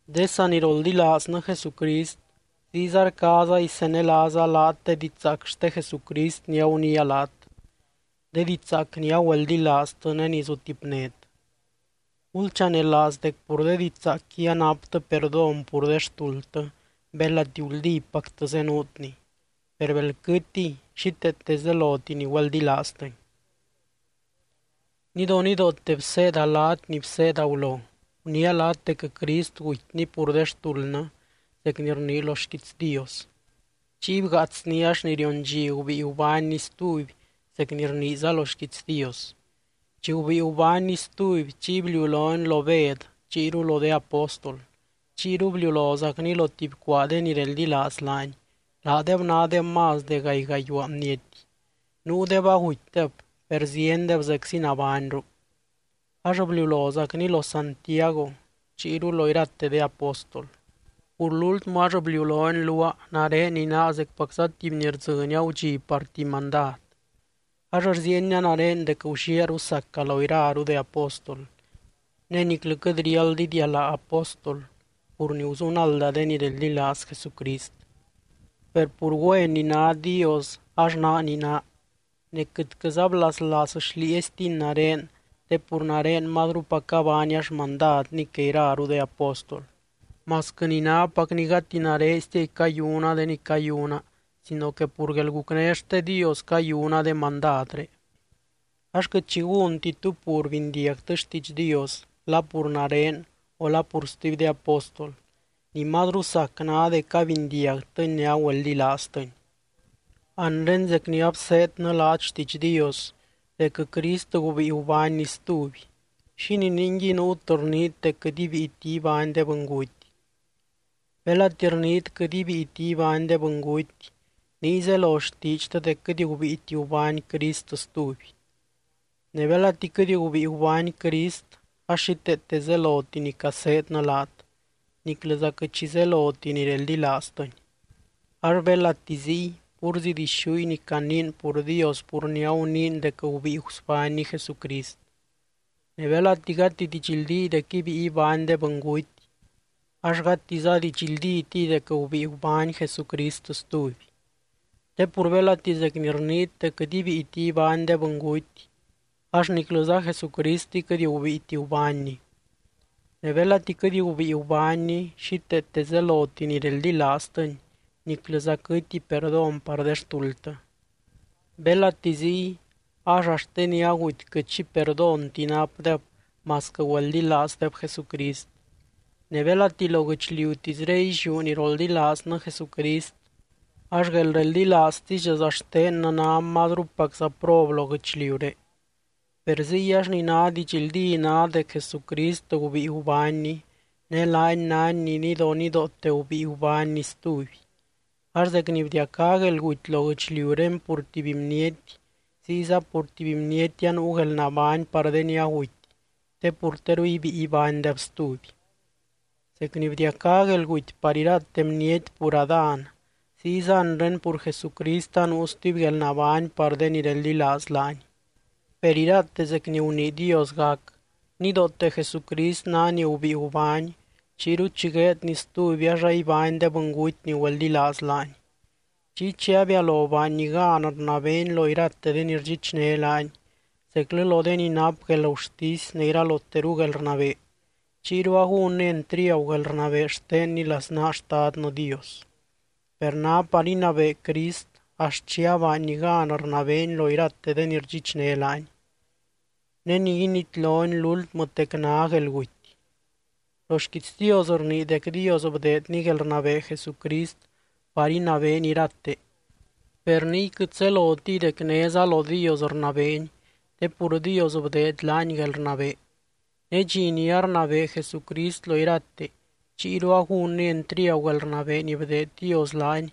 De saniroldilaaznɨ Jesucrist, ziyza rcaaza isenelaaza laat de didxzaac xte Jesucrist ni aguniia laat, de didxzaac ni agüeldilaaztɨ ne ni zutipnét. Gulchanelaaz dec pur de didxzaacqui anaptɨ perdón pur de xtuldtɨ belati guldípactɨ zenuutni, per bel quɨtiy xíteete zeloti ni güeldilaaztɨni. Nidonidoote bseeda laat ni bseeda gulo. Guniia laat dec Crist gutyny pur de xtuldnɨ zec ni rnii lo xquiits Dios. Chiy bgaatsny ax ni rion dxi gubíi gubánny stuby zec ni rniiza lo xquiits Dios. Chi gubíi gubánny stuby, chiy bliulony lo Bed chiyru lo de apóstol. Chiyru bliulozacny lo tuby cuaa de ni reldilaaz laany, laadeb nádeb más de gaay gayuaa bniety. Nuudeb agutydeb, per ziendeb zeczi nabányru. Ax bliulozacny lo Santiago chiyru lo irate de apóstol. Pur lúltmɨ ax bliulony luaa, nare ni naa zecpacza tuby ni rdzɨny agudxi par tuby mandad. Ax rziienia nare dec gulliaaru saca lo iraru de apóstol, ne niclɨ quɨt riáld idialaa apóstol pur ni guzunalda de ni reldilaaz Jesucrist. Per pur güen ni ná Dios ax naa ni naa, ne quɨtquɨza blaslaaz xlieeztiny nare te pur nare mazrupac abaania xmandadny que iraru de apóstol, masquɨ ni nápacni gati nareztiay cayuna de ni cayuna sino que pur guelgucné xte Dios cayuna de mandadré. Ax quɨt xi gúnti tú pur bindiagtɨ xtiidx Dios la pur nare o la pur stuby de apóstol, ni mazru sac ná dec abindiagtɨni ne agüeldilaaztɨni. Anre zec ni abseednɨ laat xtiidx Dios dec Crist gubíi gubánny stuby, ¿xínii ninguiy nuut rniit dec quɨt ibíiti ibány de bɨnguty? Belati rniit quɨt ibíiti ibány de bɨnguty, niy zelo xtiidxtɨ dec quɨt gubíiti gubány Crist stuby. Ne belati quɨt gubíi gubány Crist ax xíteete zeloti ni caseednɨ laat, niclɨza quɨt xi zeloti ni reldilaaztɨny. Ax belati ziy, púrzi dixúy ni caniin pur Dios pur ni aguniin dec gubíi gusbánny Jesucrist. Ne belati gati didxldíy dec ibíi ibány de bɨnguty, ax gatiza didxldítiy dec gubíi gubány Jesucrist stuby. Te pur belati zec ni rniit dec quɨt ibíiti ibány de bɨnguty, ax niclɨza Jesucristiy quɨt gubíiti gubánny. Ne belati quɨt gubíi gubánny, xíteete zeloti ni reldilaaztɨny niclɨza quɨty perdón par de xtuldtɨ. Belati ziy, ax axt de ni aguty quɨt xi perdónti napdeb masquɨ güeldilaazdeb Jesucrist. Ne belati lo guɨchliutisré illiú ni roldilaaznɨ Jesucrist ax guelreldilaaztisdxaza xtennɨ ná mazrupacza prob lo guɨchliuré. Per ziy ax ni ná didxldí ná dec Jesucrist gubíi gubánny, ne laany nány ni nidonidoote gubíi gubánny stuby. Ax zec ni bdiacá guelguty lo guɨchliuré pur tuby bniety, ziyza pur tuby bniety anuu guelnabány par de ni aguty te pur teru ibíi ibánydeb stuby. Zec ni bdiacá guelguty par irate bniety pur Adán, ziyza anre pur Jesucrist anuu stuby guelnabány par de ni reldilaaz laany. Per irate zec ni gunii Dios gac: Nidoote Jesucrist ná ni gubíi gubány, chiyru chi gueedny stuby ax aibány de bɨnguty ni güeldilaaz laany. Chiy chi abialo baanny gan rnabeeny lo irate de ni rdxichné laany, zeclɨ lo de ni nap guelgurtisy ne iraloteru guelrnabee, chiyru agúnny entriagu guelrnabee xtenny laznaa Xtadnɨ Dios. Per ná par inabee Crist axt chi abaanny gan rnabeeny lo irate de ni rdxichné laany. Ne ni initlony lúltmɨtec ná guelguty. Lo xquiits Dios rnii dec Dios bdeedny guelrnabee Jesucrist par inabeeny irate, per niy quɨt zelotiy dec néza lo Dios rnabeeny te pur Dios bdeed laany guelrnabee. Ne dxi ni arnabee Jesucrist lo irate, chiyru agúnny entriagu guelrnabee ni bdeed Dios laany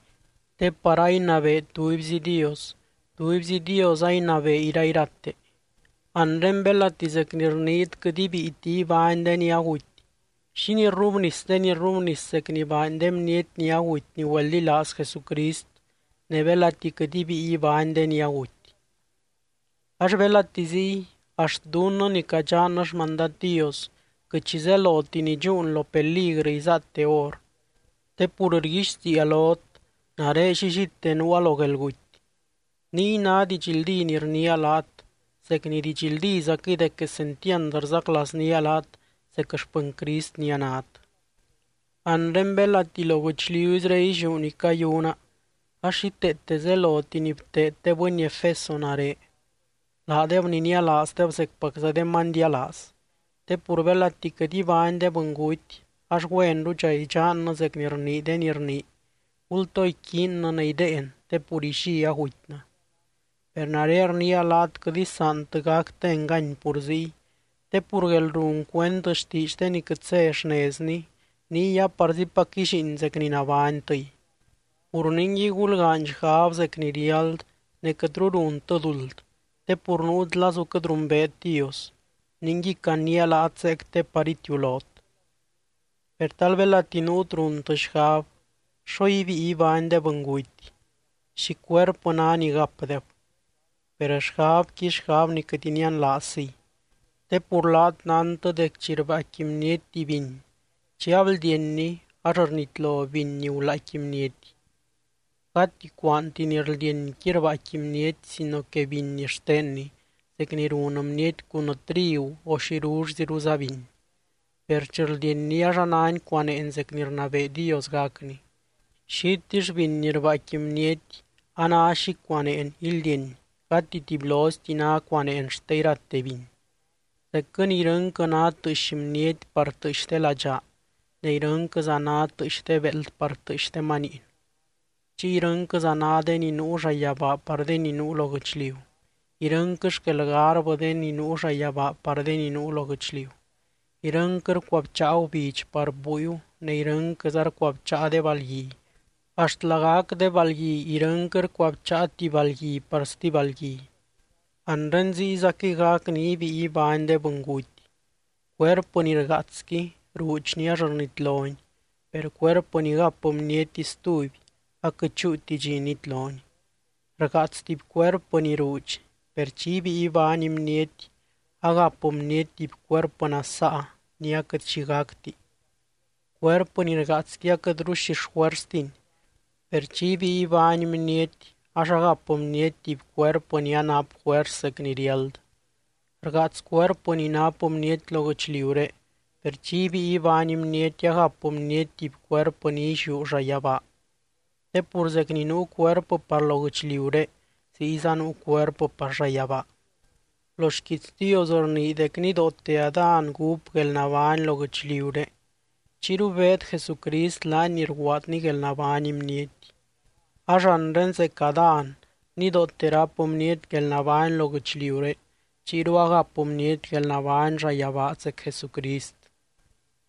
te par ainabee tubyzi Dios, tubyzi Dios ainabee irairate. Anre belati zec ni rniit quɨt ibíiti ibány de ni aguty, ¿xínii rrubnis de ni rrubnis zec ni baany de bniety ni aguty ni güeldilaaz Jesucrist, ne belati quɨt ibíi ibány de ni aguty? Ax belati ziy, axt dunnɨ ni cadxannɨ xmandad Dios, quɨt xi zeloti ni dxúun lo peligrɨ izaate hor. Te pur rguixtiia lot, nare llillite nuua lo guelguty, niy ná didxldí ni rniia laat zec ni didxldízaquɨy dec quesentiand rzaclaaznía laat zec xpɨny Crist ni anát. Anre belati lo guɨchliuzré illiú ni cayuna ax xíteete zeloti ni bteed de bɨny Efeso nare, laadeb ni nialaazdeb zecpacza de manydialaaz. Te pur belati quɨt ibány de bɨnguty ax güenrudxa idxannɨ zec ni rnii de ni rnii: “Gultoo iquiinnɨ ne idéen te pur illí agutynɨ.” Per nare rniia laat quɨt isaantɨ gactɨ engany pur ziy. Te pur guelrun cuend xtiidx de ni quɨt zé xnezni, niy aparzipac ílliin zec ni nabánytɨy. Pur ningui gulgaany xgab zec ni riáld ne quɨtru runtɨ duld te pur nuut lazu quɨt rumbeet Dios, ningui caniia laat zeec te par itiulot. Per tal belati nuut runtɨ xgab: ¿Xo ibíi ibány de bɨnguty? ¿Xi cuerpɨ ná ni gapdeb? Per xgabqui, xgab ni quɨt inianlaazziy. Te pur laat nántɨ dec chi rbaaicqui bniety tuby biny, chi abldienni ax rnitlo biny ni gulaaicqui bniety. Gati cuaanti ni rldienqui rbaaicqui bniety sino que biny xtenny, zec ni run bniety cun trigu o xirullziruza biny. Per chi rldienni ax anáni cuaneen zec ni rnabee Dios gacni, xitill biny ni rbaaicqui bniety a ná xi cuaneen ildieny gati tubyloizti ná cuaneen xte irate biny. Zecquɨ ni irɨnquɨ ná tɨɨx bniety par tɨɨx de ladxaa ne irɨnquɨza ná tɨɨx de beld par tɨɨx de maniin. Chiy irɨnquɨza ná de ni nuu llayabaa par de ni nuu lo guɨchliu, irɨnquɨ xquel garbɨ de ni nuu llayabaa par de ni nuu lo guɨchliu. Irɨnquɨ rcuabcháa gubidx par búiu ne irɨnquɨza rcuabcháa de balgui, axt lagac de balgui irɨnquɨ rcuabcháa tuby balgui par stuby balgui. Anre ziyzaquɨy gac ni ibíi ibány de bɨnguty. Cuerpɨ ni rgaatsqui ruudxni ax rnitloni, per cuerpɨ ni gap bniety stuby aquɨt chúuti dxi nitloni. Rgaats tuby cuerpɨ ni ruudxi, per chi ibíi ibány bniety agap bniety tuby cuerpɨ nasaa ni aquɨt xi gacti. Cuerpɨ ni rgaatsqui aquɨtru xi xjuerstini, per chi ibíi ibány bniety ax agap bniety tuby cuerpɨ ni anap juers zec ni riáld. Rgaats cuerpɨ ni nap bniety lo guɨchliuré, per chi ibíi ibány bniety agap bniety tuby cuerpɨ ni illiú llayabaa. Te pur zec ni nuu cuerpɨ par lo guɨchliuré ziyza nuu cuerpɨ par llayabaa. Lo xquiits Dios rnii dec nidoote Adán gúp guelnabány lo guɨchliuré. Chiyru beed Jesucrist, laany ni rguaadny guelnabány bniety. Ax anre zec Adán nidoote ráp bniety guelnabány lo guɨchliuré, chiyru agap bniety guelnabány llayabaa zec Jesucrist.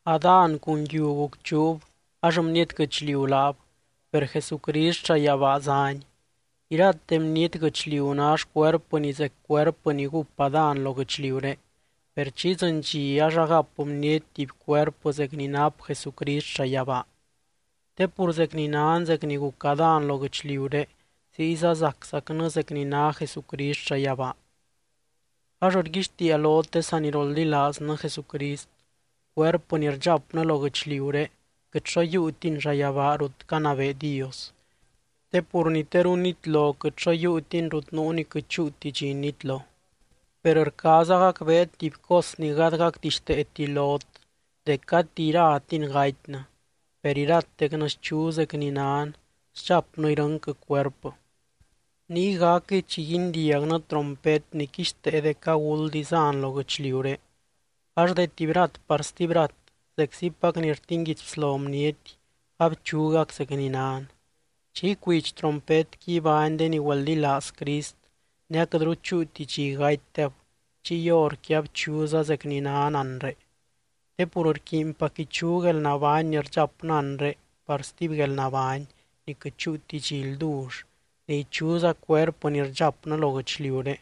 Adán cun yiu gucchuub ax bniety guɨchliu laab, per Jesucrist llayabaa zány. Irate bniety guɨchliu ná xcuerpɨni zec cuerpɨ ni gúp Adán lo guɨchliuré, per chi idzɨny dxi ax agap bniety tuby cuerpɨ zec ni nap Jesucrist llayabaa. Te pur zec ni nan zec ni guc Adán lo guɨchliuré, ziyza zaczacnɨ zec ni ná Jesucrist llayabaa. Ax rguixtiia lot de saniroldilaaznɨ Jesucrist, cuerpɨ ni rdxapnɨ lo guɨchliuré quɨt xo yiiutini llayabaa rut canabee Dios. Te pur ni teru nitlo quɨt xo yiiutini rut nuu ni quɨt chúuti dxi nitlo. Per rcaaza gacbeet tuby cos ni gady gacdixteeti lot dec gati iratin gatynɨ, per iratecnɨ schu zec ni nan, sdxapnɨ irɨnquɨ cuerpɨ. Niy gacquɨy chi guindiagnɨ trompet ni quixtee dec aguld izan lo guɨchliuré, ax de tuby rat par stuby rat zeczipac ni rtinguidy bslo bniety abchugac zec ni nan. Chi icuidx trompetqui ibány de ni güeldilaaz Crist, ne aquɨtru chúuti dxi gatydeb chiy horqui abchuza zec ni nan anre. Te pur rquiinpac ichu guelnabány ni rdxapnɨ anre par stuby guelnabány ni quɨt chúuti dxi ldull ne ichuza cuerpɨ ni rdxapnɨ lo guɨchliuré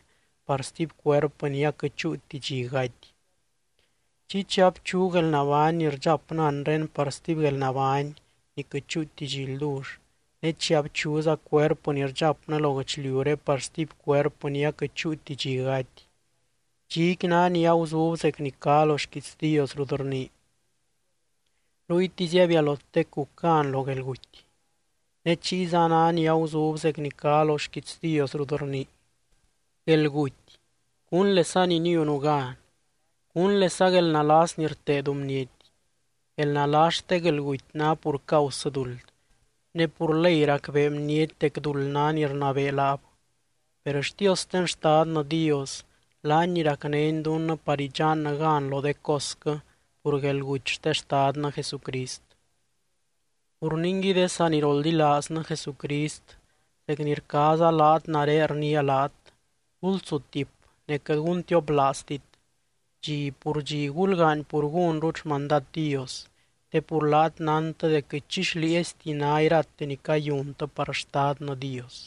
par stuby cuerpɨ ni aquɨt chúuti dxi gaty. Chiy chi abchu guelnabány ni rdxapnɨ anre par stuby guelnabány ni quɨt chúuti dxi ldull, ne chi abchuza cuerpɨ ni rdxapnɨ lo guɨchliuré par stuby cuerpɨ ni aquɨt chúuti dxi gaty, dxiqui ná ni aguzub zec ni cá lo xquiits Dios rut rnii: “Ruytisy abialotec guc gan lo guelguty.” Ne chiyza ná ni aguzub zec ni cá lo xquiits Dios rut rnii: “Guelguty, ¿cúnlesa ni niunu gan? ¿Cúnlesa guelnalas ni rteedu bniety?” Guelnalas xte guelguty ná pur causɨ duld, ne pur ley racbee bniety dec duld ná ni rnabee laab. Per xtiosten Xtadnɨ Dios, laany ni racnény dunnɨ par idxannɨ gan lo de cosquɨ pur guelguty xte Xtadnɨ Jesucrist. Pur ningui de saniroldilaaznɨ Jesucrist zec ni rcaaza laat nare rniia laat, gulsutip ne quɨt guntioplaaztit. Dxi pur dxi gulgaany pur gúnrut xmandad Dios, te pur laat nántɨ dec quɨt xlieezti ná irate ni cayuntɨ par Xtadnɨ Dios.